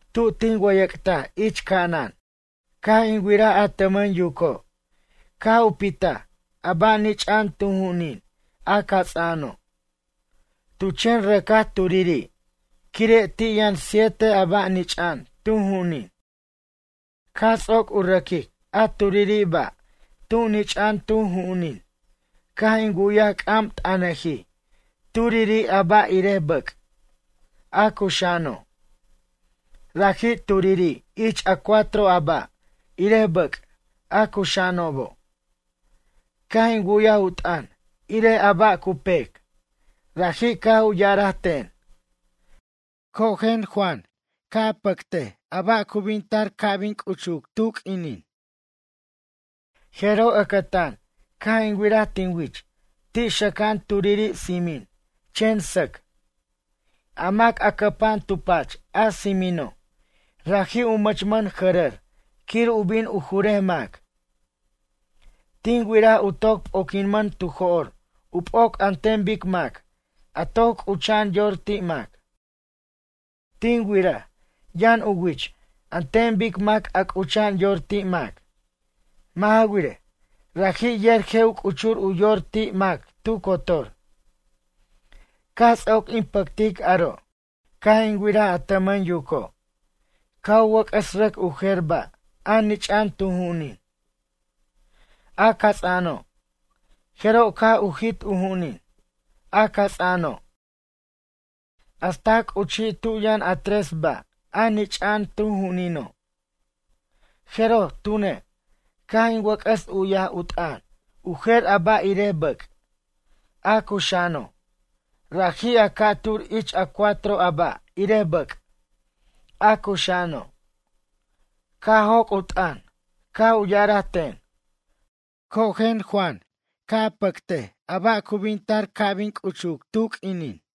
Tu tin wʌyʌc'taj ich ca'anan, caj in wiraj a tʌmʌn yuco' caj u pitaj a ba' nich'a'an tu ju'unin a cats'a'ano'. Tu chen rʌcaj turiri', quire' ti' yʌn siete a ba' nich'a'an tu ju'unin. Caj ts'oc u rʌquic a turiri' ba' tu nich'a'an tu ju'unin caj in wu'yaj c'am t'ʌnajij turiri' a ba', irej bʌc', a cuxa'ano'. Raji' turiri' ich a cuatro a ba', irej bʌc', a cuxa'anobo'. Caj in wu'yaj u t'ʌn irej a ba' cu pec. Raji' caj u ya'araj ten: ―Cojen Juan, quen, ca' a pʌct a ba' cu bin tar ca' bin c'uchuc tu q'uinin. Jeroj ʌcʌtan caj in wiraj tin wich ti' xʌca'an turiri' tsimin, chen sʌc. A mac a cʌpa'an tu pach a tsimino', raji' u mʌchmʌn jʌrʌr quir u bin u jurej mac. Tin wiraj u toc p'oquinmʌn tu jo'r u p'oc an ten bic mac a toc c'ucha'an yor ti' mac. Tin wiraj yʌn u wich an ten mac a c'ucha'an yor ti' mac. Mʌ' ja wirej, raji' yer je' u c'uchur u yor ti' mac tu cotor. Caj ts'oc in pʌctic aro', caj in wiraj a tʌmʌn yuco' caj u wʌc'ʌs rʌc u jer ba' a nich'a'an tu ju'unin, a cats'a'ano'. Jeroj caj u jit u ju'unin, a cats'a'ano' hasta c'uchij tu yʌn a tres ba' a nich'a'an tu ju'unino'. Jeroj tune', caj in wʌc'ʌs u'yaj u t'ʌn u jer a ba' irej bʌc', a cuxa'ano', raji' a ca'tur ich a cuatro a ba' irej bʌc', a cuxa'ano'. Caj joc' u t'ʌn, caj u ya'araj ten: ―Cojen, quen, Juan, ca' a pʌct a ba' cu bin tar ca' bin c'uchuc tu q'uinin.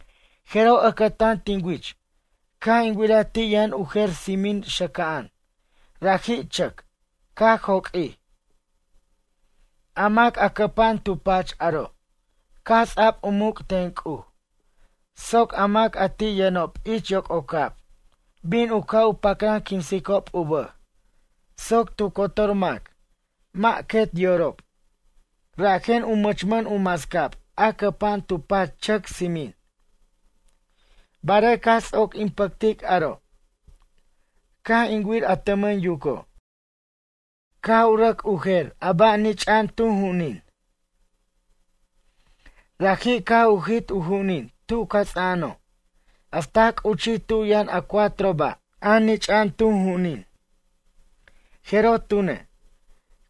Jeroj ʌcʌtan tin wich caj in wiraj ti' yʌn u jer tsimin xʌca'an, raji' chʌc, caj joq'uij. A mac a cʌpa'an tu pach aro' caj ts'a'b u muc' ten C'uj soc a mac a ti' yʌnob ich yoc'ocab bin u ca' u pacran quinsicob u bʌj soc tu cotor mac mʌ' quet yorob, rajen u mʌchmʌn u mascab a cʌpa'an tu pach chʌc tsimin. Barej caj ts'oc in pʌtic aro', caj in wir a tʌmʌn yuco', caj u rʌc u jer a ba' nich'a'an tu ju'unin. Raji' caj u jit u ju'unin tu cats'a'ano' hasta c'uchij tu yʌn a cuatro ba', a nich'a'an tu ju'unin. Jeroj tune',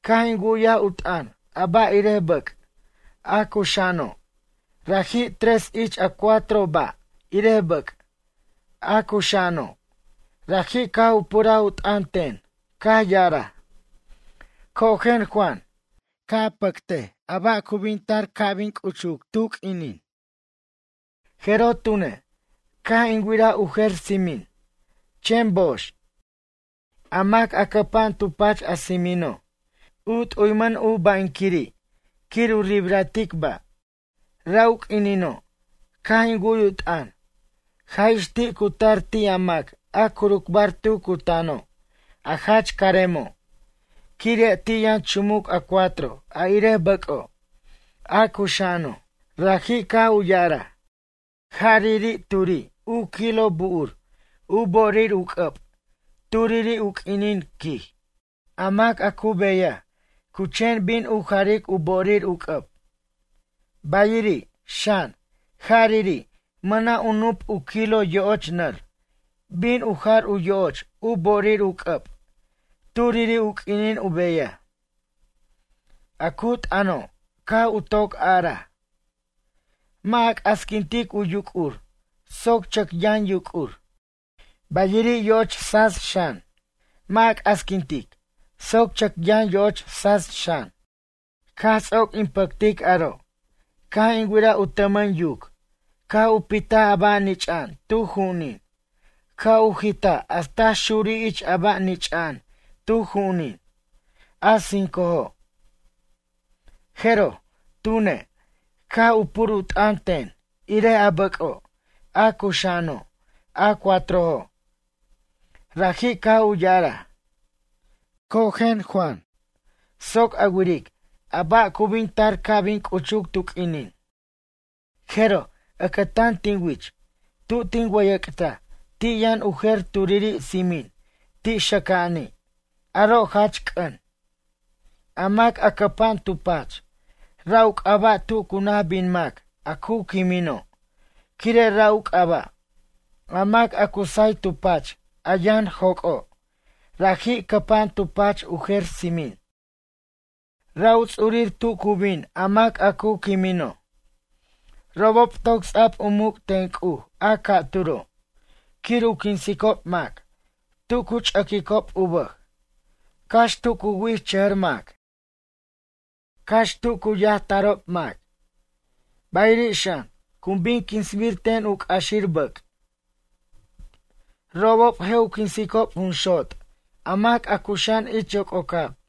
caj in wu'yaj u t'ʌn a ba' irej bʌc', a cuxa'ano', raji' tres ich a cuatro a ba' irej bʌc', a cuxa'ano'. Raji' caj u puraj u t'ʌn ten caj ya'araj: ―Cojen Juan, ca' a pʌct a ba' cu bin tar ca' bin c'uchuc tu q'uinin. Jeroj tune', caj in wiraj u jer tsimin, chen box. A mac a cʌpa'an tu pach a tsimino', u t'uymʌn u ba'inquiri' quir u ribratic ba'. Ra' u q'uinino' caj in wu'y u t'ʌn, jaj ix ti' cu tar ti' a mac a curucbar tu cutano' a jach caremo', quire' ti' yʌn chumuc a cuatro a irej bʌc'o', a cuxa'ano'. Raji' caj u ya'araj: ―Jariri' turi' u kilo bu'ur u bo'orir u c'ʌb turiri' u q'uinin ―quij―, a mac a cu beyaj cu chen bin u jaric u bo'orir u c'ʌb. Bayiri', xan, jariri' mʌna' u nup' u kilo yo'och nʌr bin u jar u yo'och u bo'orir u c'ʌb turiri' u q'uinin u beyaj. A cu t'ʌno' caj u toc a'araj: “Mʌ' a c'asquintic u yuc'ur soc chʌc yʌn yuc'ur.” Bayiri' yo'och tsats xan, mʌ' a c'asquintic soc chʌc yʌn yo'och tsats xan. Caj ts'oc in pʌctic aro' caj in wiraj u tʌmʌn yuc caj u pitaj a ba' nich'a'an tu ju'unin caj u jitaj hasta xurij ich a ba' nich'a'an tu ju'unin, a cincojo'. Jeroj, tune', caj u pur u t'ʌn ten irej a bʌco', a cuxa'ano', a cuatrojo'. Raji' caj u ya'araj: ―Cojen, quen, Juan, soc a wiric a ba' cu bin tar ca' bin c'uchuc tu q'uinin. Jeroj ʌcʌtan tin wich tu tin wʌyʌc'taj ti' yʌn u jer turiri' tsimin ti' xʌca'ani', aro' jach c'ʌn. A mac a cʌpa'an tu pach, ra' u c'aba' tu cu naj bin mac a cu quimino' quire' ra' u c'aba'. A mac a cu say tu pach a yʌn joc'o', raji' cʌpa'an tu pach u jer tsimin. Ra' u ts'urir tu cu bin a mac a cu quimino'. Robob toc ts'a'b u muc' ten C'uj a ca'turo', quir u quinsicob mac tu cu ch'ʌquicob u bʌj, cax tu cu wi'ichʌjʌr mac, cax tu cu yajtarob mac, bayiri' xan cu bin quinsbir ten u c'axir bʌc'. Robob je' u quinsicob junxot' a mac a cuxa'an ich yoc'ocab.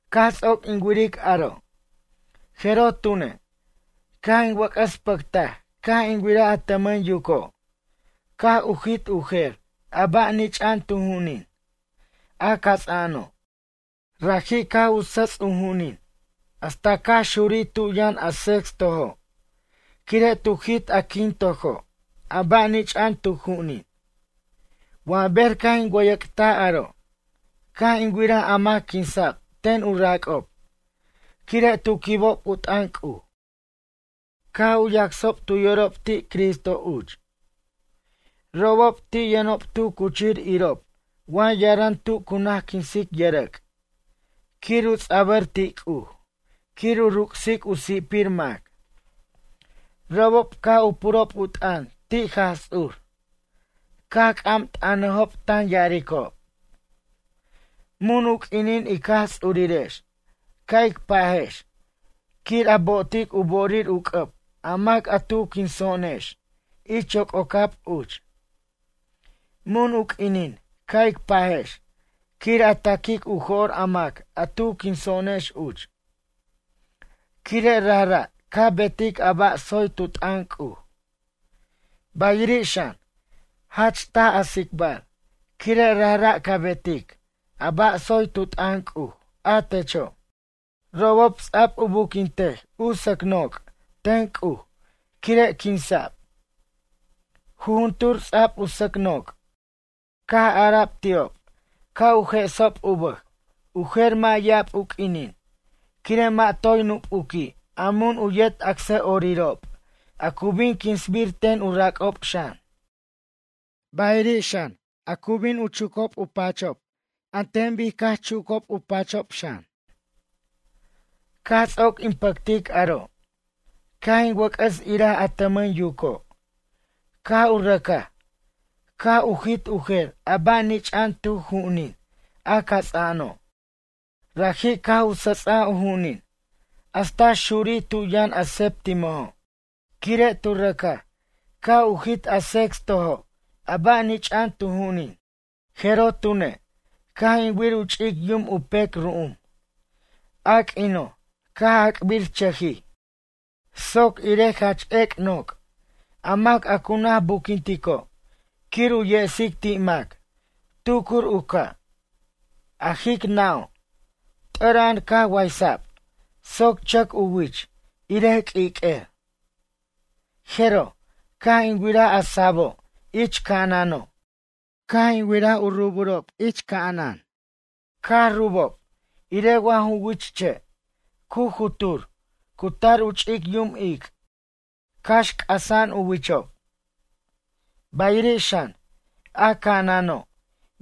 Caj ts'oc in wiric aro', jeroj tune', caj in wʌc'ʌs pʌctaj caj in wiraj a tʌmʌn yuco', caj u jit u jer a ba' nich'a'an tu ju'unin, a cats'a'ano'. Raji' caj u sʌts' u ju'unin hasta caj xurij tu yʌn a sextojo' quire' tu jit a quintojo' a ba' nich'a'an tu ju'unin. Wa ber caj in wʌyʌc'taj aro', caj in wiraj a mac quinsa'b ten u rac'ob quire' tu quibob u t'ʌn C'uj caj u yacsob tu yorob ti' Cristo uch. Robob ti' yʌnob tu cuchir irob wa yaran tu cu naj quinsic yʌrʌc' quir u ts'abʌr ti' C'uj quir u ruc'sic u si'pir mac. Robob caj u purob u t'ʌn ti' Jaj Ts'ur, caj c'am t'ʌnajob tan ya'aricob: ―Mun u q'uinin ic Jaj Tsurirex ca' ic pajex quir a bo'otic u bo'orir u c'ʌb a mac a tu quinso'onex ich yoc'ocab uch? Mun u q'uinin ca' ic pajex quir a ta'quic u jo'r a mac a tu quinso'onex uch, quire' rajra' ca betic a ba' tsoy tu t'ʌn C'uj. Bayiri' xan, jach taj a tsicbar quire' rajra' ca betic a ba' tsoy tu t'ʌn C'uj, a techo'. Robob ts'a'b u buquintaj u sʌc noc' ten C'uj quire' quinsa'b. Jujuntur ts'a'b u sʌc noc'. Caj ara'b ti'ob ca' u je'sob u bʌj u jer mʌ' ya'ab u q'uinin quire' mʌ' toy nupuqui' a mun u yet acsʌ'orirob a cu bin quinsbir ten u rac'ob xan. Bayiri' xan, a cu bin u chucob u pachob an ten bic caj chucob u pachob xan. Caj ts'oc in pʌctic aro', caj in wʌc'ʌs iraj a tʌmʌn yuco', caj u rʌcaj, caj u jit u jer a ba' nich'a'an tu ju'unin, a cats'a'ano'. Raji' caj u sʌts'aj u ju'unin hasta xurij tu yʌn a septimojo', quire' tu rʌcaj caj u jit a sextojo' ba', a nich'a'an tu ju'unin. Jeroj tune', caj in wir u ch'ic yum u pec ru'um, a q'uino' caj ac'birchʌjij soc irej jach ec' noc', a mac a cu naj buquintico' quir u yesic ti' mac, tucur u ca'. A jic nʌ'o', t'ʌra'an caj waysa'b soc chʌc u wich irej q'uiq'uer. Jeroj, caj in wiraj a sabo' ich ca'anano', caj in wiraj u rubob ich ca'anan, caj rubob irej wa ju wich che' cu jutur cu tar u ch'ic yum ic', cax c'asa'an u wichob. Bayiri' xan, a ca'ano',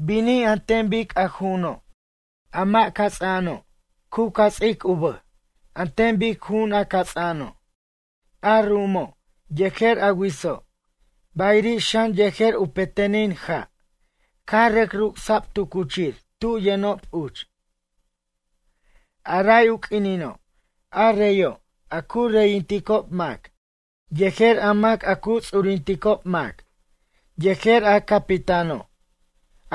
binij an ten bic a ju'uno', a mʌ' cats'a'ano', u cats'ic u bʌj an ten bic ju'un a cats'a'ano'. A ru'umo' yejer u witso' bayiri' xan yejer u petenin ja' caj rʌc ruc'sa'b tu cuchir tu yʌnob uch. A ray u q'uinino', a reyo', a cu reyinticob mac, yejer a mac a cu ts'urinticob mac, yejer a capitano',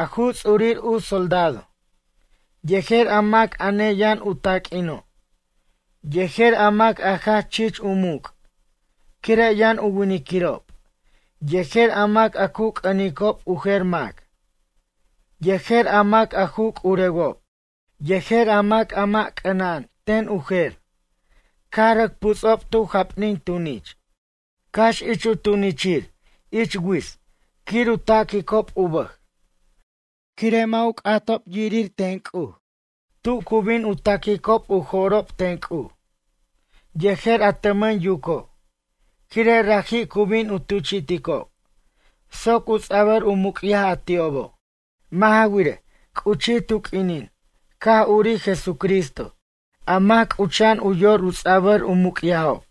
a ju ts'urir u soldado, yejer a mac a neyʌn u taq'uino', yejer a mac a jach chich u muc' quire' yʌn u winiquirob, yejer a mac a cu c'ʌnicob u jer mac, yejer a mac a ju c'urewob, yejer a mac a mʌ' c'anan ten u jer, caj rʌc puts'ob tu japnin tunich, cax ich u tunichir ich wits' quir u tac'birob u bʌj, quire' mʌ' u c'atob irir ten C'uj tu cu bin u taquicob u jo'rob ten C'uj, yejer a tʌmʌn yuco', quire' raji' cu bin u tuchi'ticob soc u ts'a'bʌr u muc'yaj a ti'obo'. Mʌ' ja wirej, c'uchij tu q'uinin caj urij Jesucristo a mac c'ucha'an u yor ts'abʌr u muc'yajob.